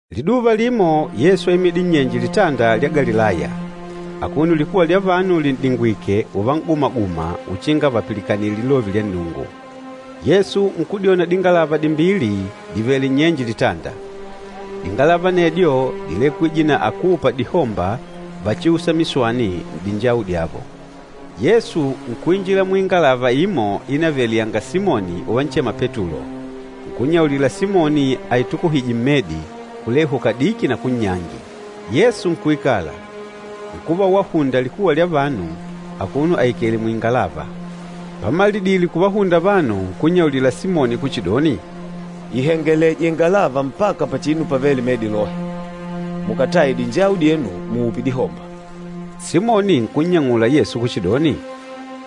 Liduva limo, Yesu áimidile nnyenje Litanda lya Galilaya, akuno likuwa lya vanu lin'dingwike uvagumanagumana uchinga vapilikanile lilove lya Nnungu. Yesu nkudyona dingalava dimbili divèlè nnyenje litanda. Dingalava anedyo dílekwije na akúupa dihomba vachiûsa miswani n'dinjawu dyavo. Yesu nkuinjila muingalava imo ínavele yanga Simoni uvanchema Petulo, nkunnyaulila Simoni aitukuhije mmedi, kulehu kadiki na kunnyangi. Yesu nkuikala, nkuva wahunda likuwa lya vanu akuno aikèlè mwingalava. Pamalidile kuvahunda vanu, nkunnyaulila Simoni kuchidoni, “Ihengeleje ingalava mpaka pachinu pavêle medi lohe, mukataye dinjawu dyenu, muupe dihomba.” Simoni nkunnyang'ula Yesu kuchidoni,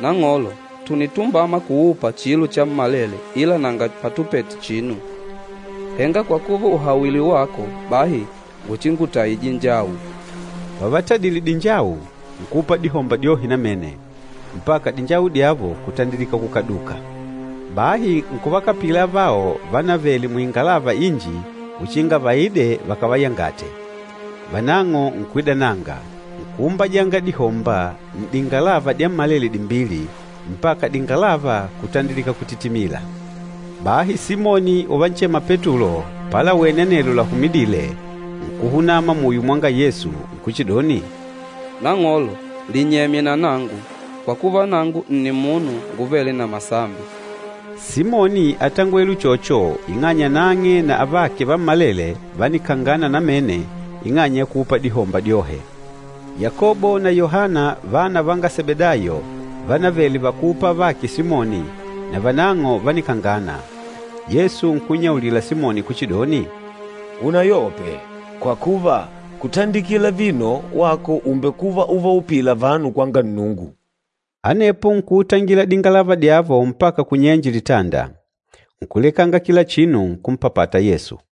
“Nang'olo, tùnitumbama kuupa chilo chammalele ila nanga patupete chinu. Henga kwa kuva ùhawile wako, bahi nguchingutaye dinjawu.” Pavatadile dinjawu, nkuupa dihomba dyohe namene, mpaka dinjawu dyavo kutandilika kukaduka. Bahi nkuvakapila avao vanavele muingalava inji uchinga vaide vakavayangate. Vanang'o nkuidananga, nkuumbajanga dihomba n'dingalava dyammalele dimbili, mpaka dingalava kutandilika kutitimila. Bahi Simoni uvanchema Petulo palawene anelo lahumidile, nkuhunama muyo mwa Yesu nkuchidoni, “Nang'olo, linyemye na nangu! Kwa kuva, nangu nni munu nguvêle na masambi!” Simoni átangwele uchocho ing'anya nang'e na avake vammalele vánikangana namene ing'anya ya kuupa dihomba dyohe. Yakobo na Yohana vana vanga Sebedayo, vanavele vakúupa avake Simoni, na vanang'o vánikangana. Yesu nkunnyaulila Simoni kuchidoni, “Unayope, kwa kuva kutandikila vino wako ùmbekuva uvaupìlà vanu kwanga Nnungu.” Anepo nkuutangila dingalava dyavo mpaka kunyenje litanda, nkulekanga kila chinu, nkumpapata Yesu.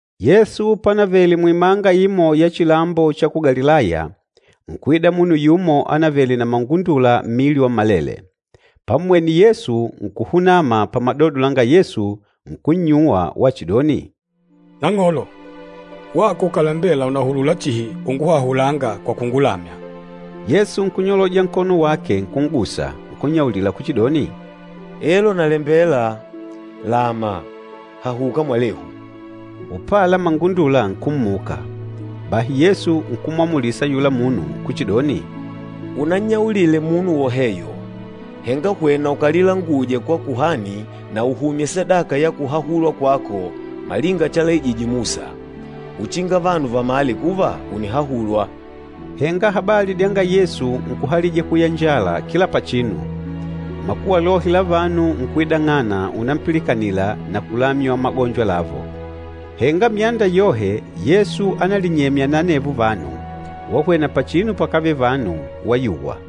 Yesu pánavèlè muimanga imo ya chilambo cha ku Galilaya, nkuida munu yumo anavele na mangundula mmili wammalele. Pammwene Yesu, nkuhunama pamadodo langa Yesu nkunnyuwa wachidoni, “Nang'olo, wako ukàlembela unahulula chihi unguhahulanga kwa kungulamya.” Yesu nkunyoloja nkono wake nkun'gusa, nkunnyaulila kuchidoni, “Elo nalembela, lama. Hahuka mwalehu!” Upala mangundula nkummuka. Bahi Yesu nkumwamulisa ayula munu kuchidoni, “Unannyaulile munu woheyo, henga hwena ukalilanguje kwa kuhani na uhumye sadaka ya kuhahulwa kwako malinga chalaijije Musa, uchinga vanu vamale kuva ùnihahulwa.” Henga habali dyanga Yesu nkuhalija kuyanjala kila pachinu. Makuwa lohe la vanu nkuidang'ana unampilikanila na kulamywa magonjo lavo. Henga myanda yohe Yesu ánalinyemya na anevo vanu wahwena pachinu pakavele vanu, wayuwa.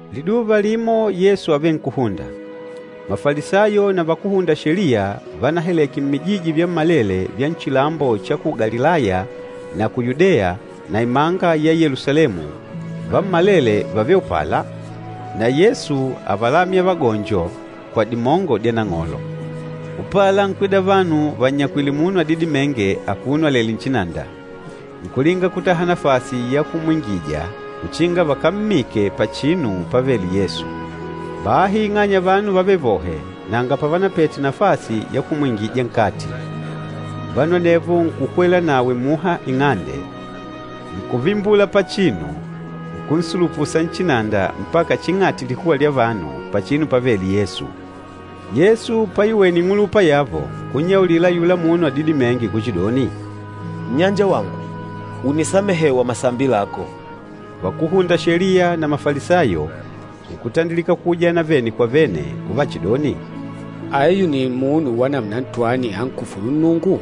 Liduva limo Yesu ávenkuhunda. Mafalisayo na vakúhunda Sheliya vánahaleke mmijiji vyammalele vya nchilambo cha ku Galilaya na ku Yudeya na imanga ya Yelusalemu, vammalele vávele upala. Na Yesu ávalamya vagonjo kwa dimongo dya Nang'olo. Upala nkwida vanu vannyakwìlè munu adidimênge, akuno alèlè nchinanda. Nkulinga kutaha nafasi ya kumwingija uchinga vakammike pachinu pávèlè Yesu. Bahi ing'anya vanu vávele vohe, nanga pavanapete nafasi ya kumwingija nkati. Vanu anevo nkukwela nawe muha ing'ande, nkuvimbula pachinu, nkunsulupusa nchinanda mpaka ching'ati likuwa lya vanu, pachinu pávèlè Yesu. Yesu paiwene ing'ulupa yavo, nkunyaulila ayula munu adidimênge kuchidoni, “Nnyanjawangu, ùnisamehewa masambi lako.” Vakúhunda Sheliya na Mafalisayo nkutandilika kuujana vene kwa vene uvachidoni, “Ayu ni munu wa namuna ntwani ankufûlu Nnungu?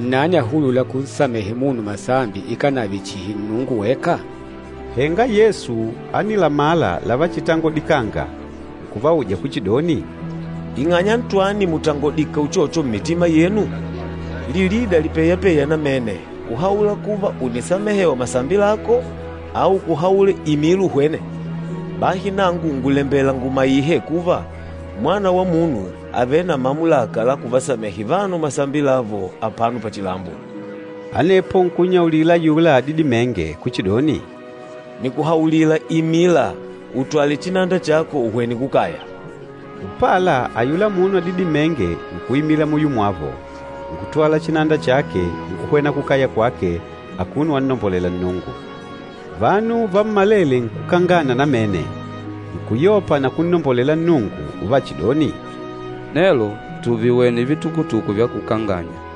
Nnani ahulûla kunsamehe munu masambi ikànave chihi Nnungu weka?” Henga Yesu ánilamala lavachitangodikanga, nkuvauja kuchidoni, “Ing'anya ntwani mùtangodikanga uchocho mmitima yenu? Lilida lipeyapeya namene, kuhaula kuva, ‘Ùnisamehewa masambi lako,’ au kuhaula, ‘Imila uhwene?’ Bahi nangu ngùlembela ngumaihe kuva, Mwana wa Munu àvele na mamulaka la kuvasamehe vanu masambi lavo apano pachilambo.” Anepo nkunnyaulila ayula adidimênge kuchidoni, “Nìkuhaulila, imila, utwale chinanda chako, uhwene kukaya!” Upala ayula munu adidimênge nkuimila muyo mwavo, nkutwala chinanda chake, nkuhwena kukaya kwake, akuno wannombolela Nnungu. Vanu vammalele nkukangana namene! Nkuyopa na kunnombolela Nnungu uvachidoni, “Nelo tùviwene vitukutuku vya kukanganya.”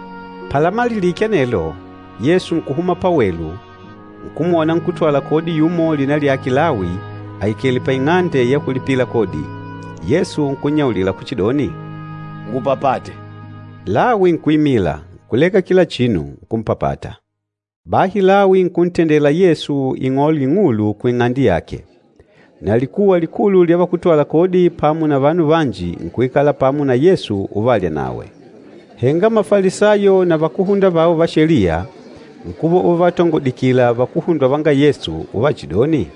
Palamalilike anelo, Yesu nkuhuma pawelu nkumwona nkútwala kodi yumo lina lyake Lawi aikèlè paing'ande ya kulipila kodi. Yesu nkunnyaulila kuchidoni, “Ngupapate!” Lawi nkuimila, nkuleka kila chinu, nkumpapata. Bahi Lawi nkuntendela Yesu ing'ole ing'ulu kuing'ande yake. Na likuwa likulu lya vakútwala kodi pamo na vanu vanji nkuikala pamo na Yesu uvalya nawe. Henga Mafalisayo na vakúhunda vao va Sheliya, nkuva uvavatongodikila vakuhundwa vanga Yesu uvachidoni,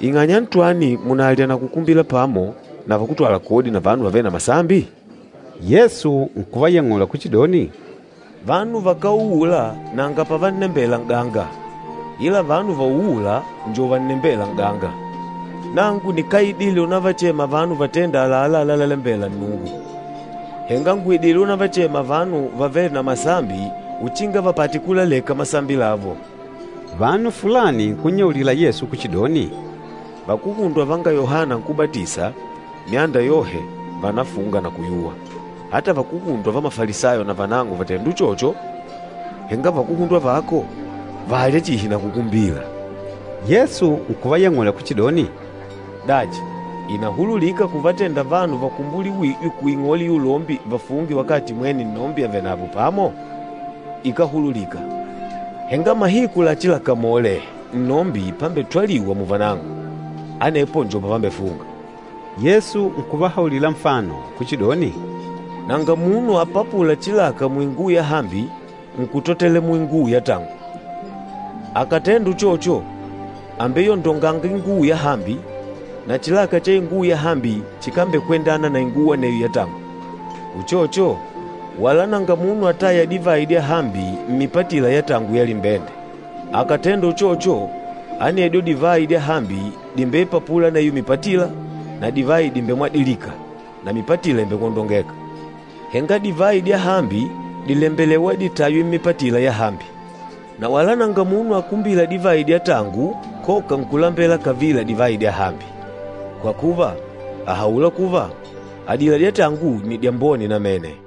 “Ing'anya ntwani mùnalya na kukumbila pamo na vakútwala kodi na vanu vavêle na masambi?” Yesu nkuvayang'ula kuchidoni, “Vanu vakáuula nanga pavannembela n'ganga, ila vanu vauûla njo vannembêla n'ganga. Nangu nikáidile unavachema vanu vatênda àlalá lalalembela Nnungu, henga ngùidile unavachema vanu vavêle na masambi uchinga vapate kulaleka masambi lavo.” Vanu fulani nkunnyaulila Yesu kuchidoni, “Vakuhundwa vanga Yohana Nkúbatisa myanda yohe vànafunga na kuyuwa, ata vakuhundwa va Mafalisayo navanang'o vàtenda uchocho, henga vakuhundwa vako, vàlya chihi na kukumbila!” Yesu nkuvayang'ula kuchidoni, “Dachi, ìnahululika kuvatenda vanu vakumbuliwîjwe kuing'ole ya ulombi vafunge wakati mwene nnombi avenavo pamo? Ikáhululika. Henga mahiku lachilakamole nnombi pambetwaliwa muvanang'o, anepo njo pavambefunga.” Yesu nkuvahaulila nfano kuchidoni, “Nanga munu apapûla chilaka muinguwo yahambi nkutotela muinguwo yatangu. Akàtenda uchocho, àmbeyondonga inguwo yahambi, na chilaka cha inguwo yahambi chikambekwendana na inguwo aneyo yatangu. Uchocho, wala nanga munu atâya divayi dyahambi mmipatila ya tangu ya limbende. Akàtenda uchocho, anedyo divayi dyahambi dìmbeipapula aneyo mipatila, na divayi dìmbemwadilika, na mipatila ìmbekwondongeka. Henga divayi dyahambi dìlembelewa ditaywe mmipatila yahambi. Na wala nanga munu akumbîla divayi dya tangu koka nkulambela kavila divayi dyahambi. Kwa kuva, àhaula kuva, adila dya tangu nni dyambone namene.”